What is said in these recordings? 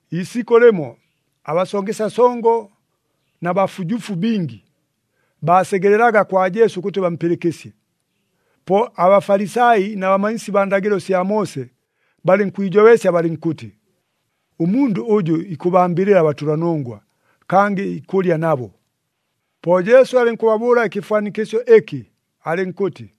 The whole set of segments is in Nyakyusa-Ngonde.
Iisikʉ lɨmo, abasongesya songo na bafujufu bingi, baasegelelaga kwa Jesu ʉkʉtɨ bampɨlɨkɨsye. Po aBafalisai na bamanyisi baa ndagɨlo sya Moose, balɨnkwijobeesya balɨnkʉtɨ, “Ʉmundʉ ʉjʉ ikʉbambɨlɨla abatʉlanongwa, kangɨ ikʉlya nabo.” Po Jesu alɨnkʉbabʉʉla ɨkɨfwanikɨsyo ɨkɨ, alɨnkʉtɨ,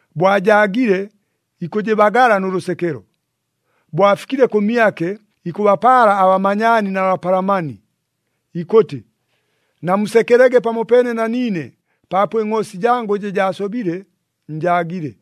Bo ajaagile, ikʉjɨbagala nʉ lʉsekelo. Bo afikile kʉmyake, ikʉbapaala abamanyaani na bapalamani, ikʉtɨ, ‘Namusekelege pamopeene na niine, paapo ɨngʼoosi jangʉ ɨjɨ jaasobile, njaagile!’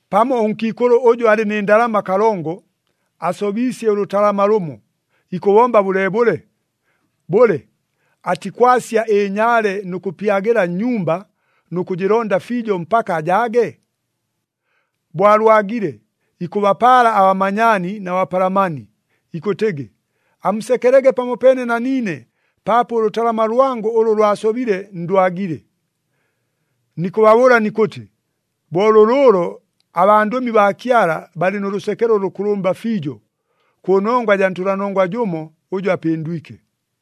“Pamo ʉnkiikʉlʉ ʉjʉ alɨ nɨ ndalama kalongo, asobiisye ʉlʉtalama lʉmo, ikʉbomba bʉleebʉle? Bʉle, atikwasya ɨnyaale nʉ kʉpyagɨla nnyumba, nʉ kʉjɨlonda fiijo mpaka ajaage? Bo alwagile, ikʉbapaala abamanyaani na bapalamani, ikʉtɨgɨ, ‘Amusekelege pamopeene na niine, paapo ʉlʉtalama lwangʉ ʉlʉ lwasobile, ndwagile!’ “Nikʉbabʉʉla nikʉtɨ, bo lʉlʉʉlo abandʉmi baa Kyala balɨ nʉ lʉsekelo ʉlʉkʉlʉmba fiijo, kʉnongwa jaa ntʉlanongwa jʉmo ʉjʉ apɨndwike.”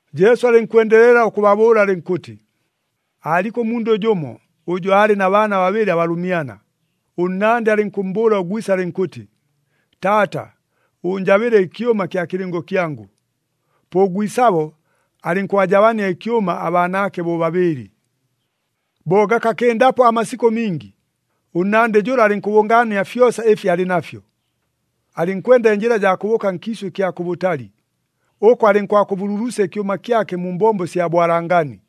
Jesu alɨnkwendelela ʉkʉbabʉʉla alɨnkʉtɨ, “Aaliko ʉmundʉ jʉmo, ʉjʉ aalɨ na baana babɨlɨ abalʉmyana. Ʉnnandɨ alɨnkʉmmbʉʉla ʉgwise alɨnkʉtɨ, ‘Taata, ʉʉnjabɨle ɨkyʉma kya kɨlɨngo kyangʉ.’ Po ʉgwisabo alɨnkʉbajabania ɨkyʉma abaanaake bobabɨɨlɨ. “Bo gakakɨndapo amasikʉ mingi, ʉnnandɨ jʉla alɨnkʉbʉngaania fyosa ɨfi alɨ nafyo, alɨnkwenda ɨnjɨla jaa kʉbʉʉka nkiisʉ ɨkya kʉbʉtali. Ʉko alɨnkwakʉbululusya ɨkyʉma kyake mu mbombo sya bwalangani.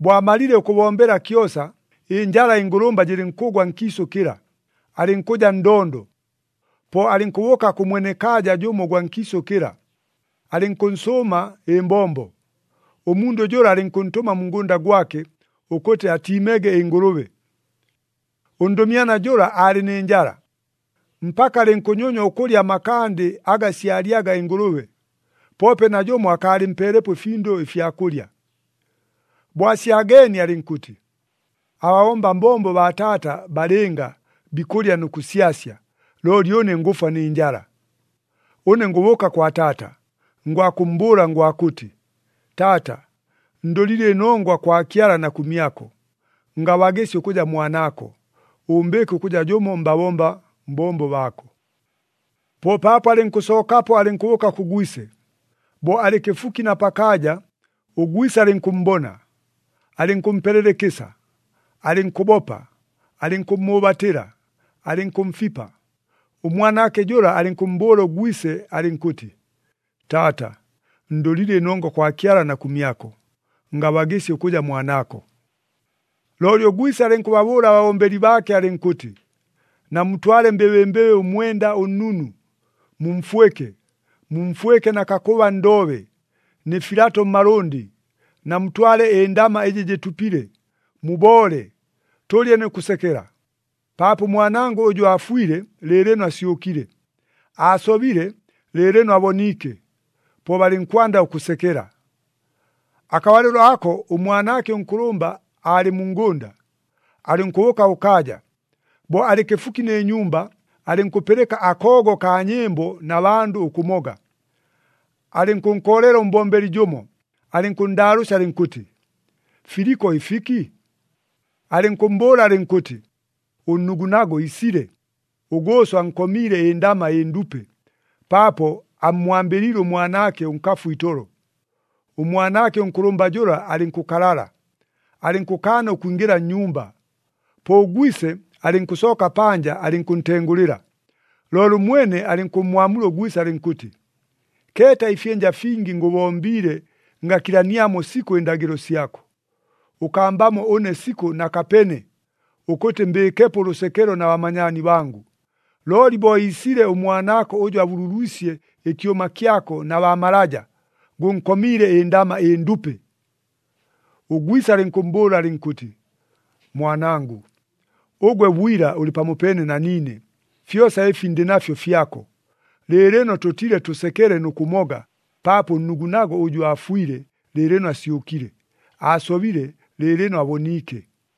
Bo amalile ʉkʉbombela kyosa, ɨnjala ɨngʉlʉmba jɨlɨnkʉgwa nkiisʉ kɨla, alɨnkʉja ndondo. Po alɨnkʉbʉʉka kʉ mwenekaaja jʉmo ʉgwa nkiisʉ kɨla, alɨnkʉnsʉʉma ɨmbombo. Ʉmundʉ jʉla alɨnkʉntʉma mu ngʉnda gwake, ʉkʉtɨ atiimege ɨngʉlʉbe. Ʉndʉmyana jʉla aalɨ nɨ njala, mpaka alɨnkʉnyonywa ʉkʉlya amakandi aga syalyaga ɨngʉlʉbe, poope najʉmo akaalɨmpeelepo ɨfindʉ ɨfya kʉlya. “Bo asyageenie alɨnkʉtɨ, ‘Ababomba mbombo baa taata balɨnga, bikʉlya nʉ kʉsyasya, looli ʉne ngʉfwa nɨ njala! Ʉne ngʉbʉʉka kwa taata, ngwakʉmmbʉʉla ngwakʉtɨ, “Taata, ndʉlile ɨnongwa kwa Kyala na kʉmyako. Ngabagɨsya ʉkʉja mwanaako, ʉʉmbɨɨke ʉkʉja jʉmo mbabomba mbombo baako.” ’ “Po paapo alɨnkʉsookapo alɨnkʉbʉʉka kʉ gwise. Bo alɨ kɨfuki na pakaaja, ʉgwise alɨnkʉmmbona, alɨnkʉmpelela ɨkɨsa, alɨnkʉbopa, alɨnkʉmmʉʉbatɨla, alɨnkʉmfipa. Ʉmwanaake jʉla, alɨnkʉmmbʉʉla ʉgwise alɨnkʉtɨ, ‘Taata, ndʉlile ɨnongwa kwa Kyala na kʉmyako. Ngabagɨsya ʉkʉja mwanaako.’ “Looli ʉgwise alɨnkʉbabʉʉla ababombeli baake alɨnkʉtɨ, ‘Namutwale mbɨbɨmbɨbɨ ʉmwenda ʉnnunu, mumfwɨke. Mumfwɨke na kakʉba ndoobe, nɨ filato mmalʉndɨ. Namutwale ɨndama ɨjɨ jɨtupile, muboole, tʉlye nʉ kʉsekela. Paapo ʉmwanangʉ ʉjʉ aafwile, lɨɨlɨno asyʉkile; aasobile, lɨɨlɨno aboniike!’ Po balɨnkwanda ʉkʉsekela. “Akabalɨlo ako ʉmwanaake ʉnkʉlʉmba aalɨ mu ngʉnda. Alɨnkʉbʉʉka kʉkaaja. Bo alɨ kɨfuki nɨ nyumba, alɨnkʉpɨlɨka akoogo kaa nyɨmbo na bandʉ ʉkʉmoga. Alɨnkʉnkoolela ʉmbombeli jʉmo, alɨnkʉnndaalʉʉsya alɨnkʉtɨ, ‘Filiko ɨfiki?’ Alɨnkʉmmbʉʉla alɨnkʉtɨ, ‘Ʉnnugunago iisile, ʉgʉʉso ankomiile ɨndama ɨndupe, paapo ammwambɨliile ʉmwanaake ʉnkafu itolo.’ Ʉmwanaake ʉnkʉlʉmba jʉla alɨnkʉkalala, alɨnkʉkaana ʉkwingɨla nnyumba. Po ʉgwise alɨnkʉsooka panja alɨnkʉntengʉlɨla. Looli ʉmwene alɨnkʉmmwamula ʉgwise alɨnkʉtɨ, ‘Keeta ɨfyɨnja fingi ngʉbombiile, ngakilaniamo sikʉ ɨndagɨlo syako! Ʉkambamo ʉne sikʉ na kapeene, ʉkʉtɨ mbɨɨkepo ʉlʉsekelo na bamanyaani bangʉ. Looli bo iisile ʉmwanaako ʉjʉ abululwisye ɨkyʉma kyako na baa malaja, gʉnkomiile ɨndama ɨndupe!’ “Ʉgwise alɨnkʉmmbʉʉla alɨnkʉtɨ, ‘Mwanangʉ, ʉgwe bwila ʉlɨ pamopeene na niine, fyosa ɨfi ndɨ nafyo fyako. Lɨɨlɨno tʉtile tʉsekele nʉ kʉmoga, paapo ʉnnugunago ʉjʉ aafwile, lɨɨlɨno asyʉkile. Aasobile, lɨɨlɨno aboniike!’”